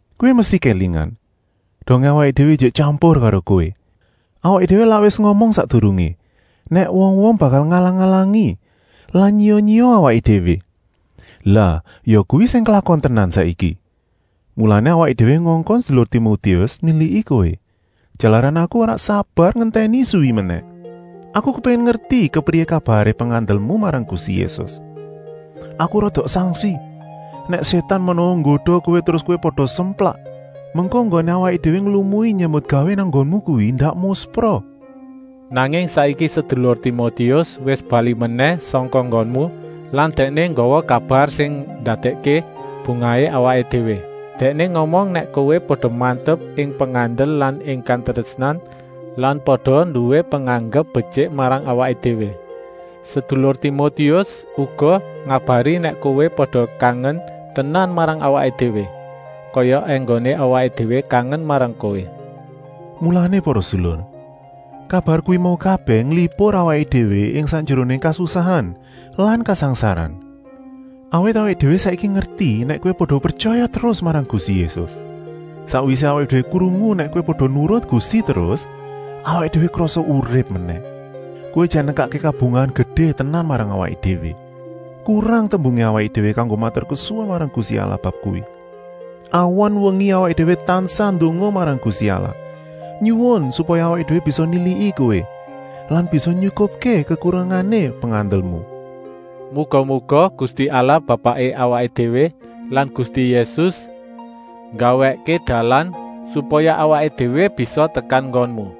Kowé mesti kélingan, dongé awaké déwé ijik tyampur karo kowé, awaké déwé lak wis ngomong sakdurungé nèk wong-wong bakal ngalang-alangi lan nyiya-nyiya awaké déwé. Lah yakuwi sing klakon tenan saiki. Mulané awaké déwé ngongkon sedulur Timotius niliki kowé, jalaran aku ora sabar ngentèni suwi menèh. Aku kepéngin ngerti kepriyé kabaré pengandelmu marang Gusti Yésus. Aku rada sangsi nèk Sétan menawa nggoda kowé terus kowé pada semplak. Mengko enggoné awaké déwé nglumui nyambutgawé nang nggonmu kuwi ndak muspra. Nanging saiki sedulur Timotius wis balik menèh sangka nggonmu lan dèkné nggawa kabar sing ndadèkké bungahé awaké déwé. Dèkné ngomong nèk kowé pada mantep ing pengandel lan ing katrésnan lan pada nduwé penganggep betyik marang awaké déwé. Sedulur Timotius uga ngabari nèk kowé pada kangen tenan marang awaké déwé, kaya enggoné awaké déwé kangen marang kowé. Mulané para sedulur, kabar kuwi mau kabèh nglipur awaké déwé ing sakjeroné kasusahan lan kasangsaran, awit awaké déwé saiki ngerti nèk kowé pada pretyaya terus marang Gusti Yésus. Sakwisé awaké déwé krungu nèk kowé pada nurut Gusti terus, awaké déwé krasa urip menèh. Kowé jan nekakké kabungahan gedé tenan marang awaké déwé. Kurang tembungé awaké déwé kanggo maturkesuwun marang Gusti Allah bab kuwi. Awan-wengi awaké déwé tansah ndonga marang Gusti Allah, nyuwun supaya awaké déwé bisa niliki kowé lan bisa nyukupké kekurangané pengandelmu. Muga-muga Gusti Allah Bapaké awaké déwé lan Gusti Yésus nggawèkké dalan, supaya awaké déwé bisa tekan nggonmu.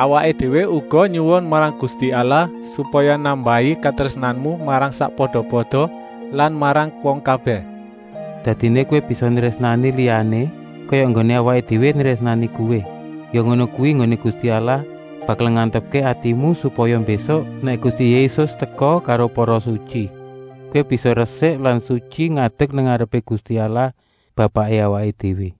Awaké déwé uga nyuwun marang Gusti Allah supaya nambahi katrésnanmu marang sakpada-pada lan marang wong kabèh. Dadiné kowé bisa nrésnani liyané kaya enggoné awaké déwé nrésnani kowé. Ya ngono kuwi enggoné Gusti Allah bakal ngantepké atimu, supaya mbésuk, nèk Gusti Yésus teka karo para sutyi, kowé bisa resik lan sutyi ngadek nang ngarepé Gusti Allah Bapaké awaké déwé.